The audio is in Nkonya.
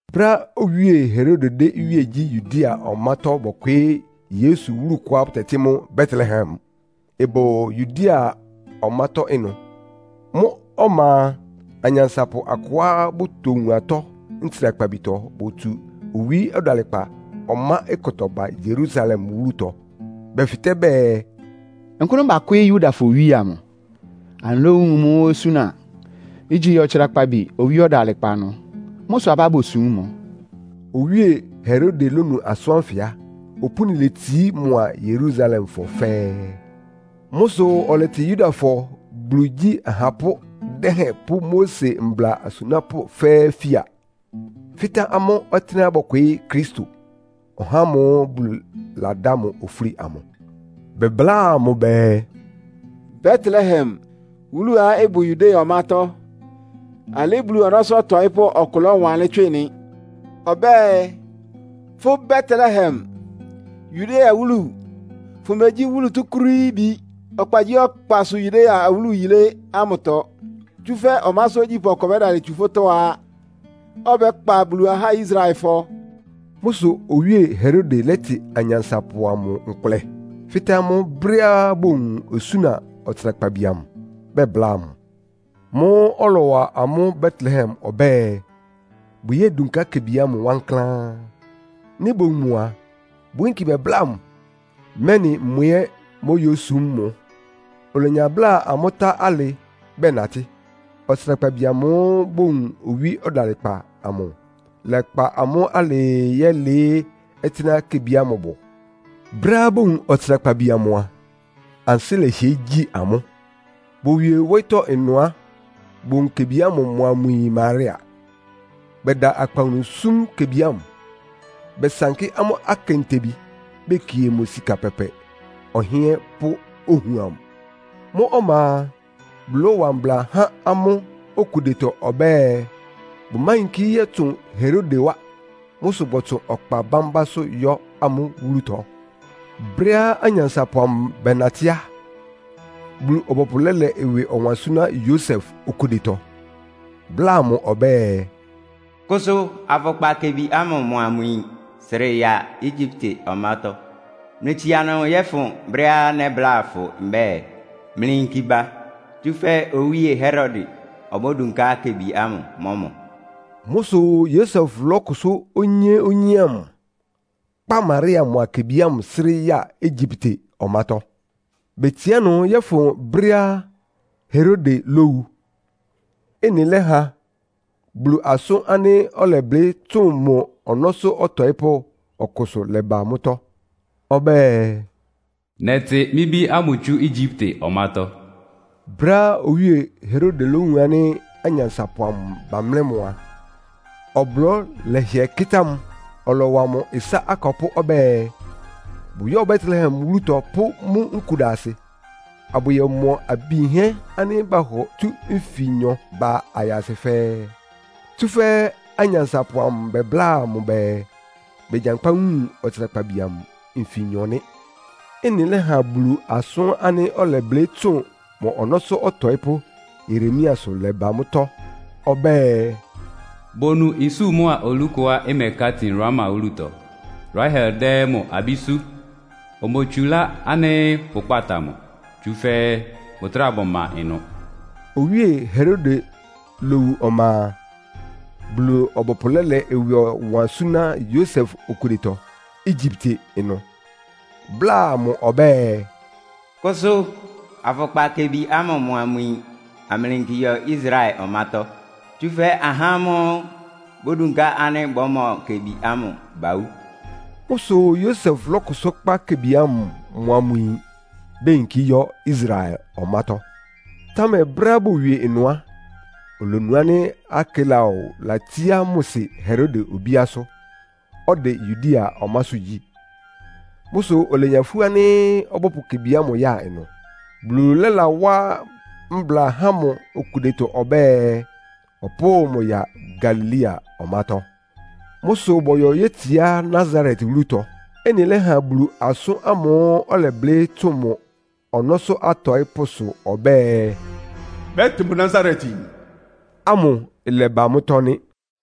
Brɛ́á Owíe Herode dɛ́ iwíe gyí Yudea ɔmátɔ́ bɔkwɩɩ́ Yesu wúlu kʋá bʋtɛtɩ́ mʋ́ Betlehem, ɩbʋ Yudea ɔmátɔ́ ɩnʋ. Mʋ́ ɔma a, anyansapʋ akʋá bʋtowun atɔ́ ntsrakpabitɔ botsu owí ɔdalɩkpa ɔmá kʋtɔ ba Yerusalem wúlutɔ. Bɛfɩtɛ́ bɛɛ, “Nkʋ́nʋ́ bakwɩ́ɩ́ Yudafɔ owíe amʋ? Anɩlówun mʋ osúna ánɩ́ igyi ɔtsrakpabi owí ɔdalɩkpa ɩnʋ. Mʋ́ sʋ abá bosúm mʋ.” Owíe Herode lónu asʋ́n ánfɩ á, opúni letsií mʋa Yerusalemfɔ fɛ́ɛ́. Mʋ́ sʋ ɔlɛtɩ Yudafɔ Bulu igyí ahapʋ́ dɛhɛn pʋ́ Mose mbla asunápʋ́ fɛ́ɛ́ fía, fɩ́tɛ́ amʋ́ ɔtɩ́nɛ́á bɔ́kwɩɩ́ Kristo, (ɔhá ámʋ́ʋ́ Bulu ladá mʋ ofúli amʋ). Bɛbláa mʋ bɛɛ “Betlehem wúluá ɩbʋ Yudea ɔmátɔ́. Alɩ́ Bulu ɔnɔ́sʋ́ ɔtɔɩ́pʋ́ ɔkʋ lɔ́wanlɩ́n tswɩ nɩ. Ɔbɛ́ɛ, ‘Fʋ́ Betlehem, Yudea wúlu, fʋmegyí wúlu túkúrííbi ɔkpagyíɔkpasʋ Yudea awúlu yilé ámʋtɔ. Tsúfɛ́ ɔmásʋ́ ogyípʋ́ ɔkʋ ɔbɛ́dalɩ tsu fʋ́tɔ́á, ɔbɛ́kpa Bulu ahá Israelfɔ.’” Mʋ́ sʋ Owíe Herode lɛ́tɩ anyansapʋ amʋ nkʋlɛ, fɩ́tɛ́ amʋ́ brɛ́á bowun osúna ɔtsrakpabi amʋ, bɛbláa mʋ. Mʋ́ʋ́ ɔlɔwa amʋ́ Betlehem ɔbɛ́ɛ, bʋyódunká kebi ámʋ wankláán. Nɩ́ bowun mʋ a, bʋyínki bɛbláa mʋ, mɛ́nɩ mʋ ɛ́ móyósum mʋ. Olenya bláa amʋ́ tá alɩ bɛnatɩ́. Ɔtsrakpabi amʋ́ʋ́ bowun owí ɔdalɩkpa amʋ, lɛ́kpa amʋ́ alɩɩ yɛ́lɩɩ́ ɔtɩ́nɛ́á kebi ámʋ bʋ. Brɛ́á bowun ɔtsrakpabi amʋ a, ansɩ́ lɛhɩɛ gyi amʋ́. Bowie wóyítɔ́ ɩnʋ á, bowun kebi ámʋ mʋa mʋ yin Maria, bɛda akpawunu súm kebi ámʋ. Bɛsankɩ́ amʋ́ akentebi, bekie mʋ sika pɛpɛ, ɔhɩ́ɛ́n pʋ́ ohuam. Mʋ́ ɔma a, Bulu lɔ́wa mbla há amʋ́ okudetɔ ɔbɛ́ɛ, bʋmáyinkí yɔ́tsʋn Herode wá. Mʋ́ sʋ bɔtsʋn ɔkpa bámbásʋ́ yɔ́ amʋ́ wúlutɔ. Brɛ́á anyansapʋ amʋ bɛnatɩ́ á, Bulu-ɔbɔpʋ lɛ́lɛ ɩwɩ ɔwan súná Yosef okudetɔ, bláa mʋ ɔbɛ́ɛ, “Kʋsʋ, afʋkpa kebi ámʋ mʋa mʋ yin srɩ ya Egyipte ɔmátɔ́. Mlɩtsia ɩnʋ yɔ́fʋn brɛ́á nɛ́bláa fʋ mbɛ́ɛ mlɩyínki ba, tsúfɛ́ Owíe Herode obódunká kebi ámʋ, mɔ́ mʋ.” Mʋ́ sʋ Yosef lɔ́kʋsʋ́ onyé-onyé ámʋ, kpá Maria mʋa kebi ámʋ srɩ́ ya Egyipte ɔmátɔ́. Betsiá ɩnʋ yɔ́fʋn brɛ́á Herode lówu. Ɩ́nɩ lɛ́ha Bulu asʋ́n ánɩ́ ɔlɛblɩ́ tsʋn mʋ ɔnɔ́sʋ́ ɔtɔɩ́pʋ́ ɔkʋsʋ lɛba mʋ́tɔ́. Ɔbɛ́ɛ, “Nɛtɩ mɩ́ bí ámʋ tsú Egyipte ɔmátɔ́.” Brɛ́á Owíe Herode lówun ánɩ́ anyansapʋ amʋ bamlɛ́ mʋ a, ɔblɔ́ lɛhɩɛ kɩ́tá mʋ́. Ɔlɔwa mʋ ɩsá akɔpʋ́ ɔbɛ́ɛ, bʋyɔ́ Betlehem wúlutɔ pʋ́ mʋ́ nkudasɩ, abʋyɔmɔ abi yinhɛ́ ánɩ́ bahɔ tsú nfinyɔ ba ayasɩ fɛ́ɛ́. Tsúfɛ́ anyansapʋ amʋ bɛbláa mʋ bɛɛ, begyankpá wun ɔtsrakpabi amʋ nfinyɔ nɩ́. Ɩ́nɩ lɛ́ha Bulu asʋ́n ánɩ́ ɔlɛblɩ́ tsʋn mʋ ɔnɔ́sʋ́ ɔtɔɩ́pʋ́ Yeremiasʋ lɛba mʋ́tɔ́. Ɔbɛ́ɛ, “Bonu isú mʋ́a olú kʋá ɩmɛká tin Rama wúlutɔ. Rahel dɛ́ mʋ abí sú. Omotsulá ánɩ́ bʋkpáta mʋ, tsúfɛ́ bʋtráa bʋma ɩnʋ.” Owíe Herode lowu ɔma a, Bulu-ɔbɔpʋ lɛ́lɛ ɩwɩ ɔwan súná Yosef okudetɔ Egyipte ɩnʋ, bláa mʋ ɔbɛ́ɛ, “Kʋsʋ, afʋkpa kebi ámʋ mʋa mʋ yin, amlɩyinki yɔ Israel ɔmátɔ́. Tsúfɛ́ ahá ámʋ́ʋ́ bodunká ánɩ́ bɔ́mɔ kebi ámʋ, bawú.” Mʋ́ sʋ Yosef lɔ́kʋsʋ́ kpá kebi ámʋ mʋa mʋ yin, beyinkí yɔ́ Israel ɔmátɔ́. Támɛ brɛ́á bowie ɩnʋ á, olonu ánɩ́ Arkelao latsíá mʋ sɩ Herode obíásʋ́, ɔdɛ Yudea ɔmásʋ́ gyí. Mʋ́ sʋ olenya ifú ánɩ́ ɔbɔ́pʋ kebi ámʋ ya ɩnʋ. Bulu lɛ́lawá mbla há mʋ okudetɔ ɔbɛ́ɛ, ɔpʋ́ʋ mʋ ya Galilea ɔmátɔ́. Mʋ́ sʋ bɔyɔ yétsiá Nasaret wúlutɔ. Ɩ́nɩ lɛ́ha Bulu asʋ́n ámʋ́ʋ́ ɔlɛblɩ́ tsʋn mʋ ɔnɔ́sʋ́ atɔɩ́pʋ́sʋ ɔbɛ́ɛ, “Bɛ́tɩ mʋ Nasaretyin” amʋ ɩlɛba mʋ́tɔ́ nɩ́.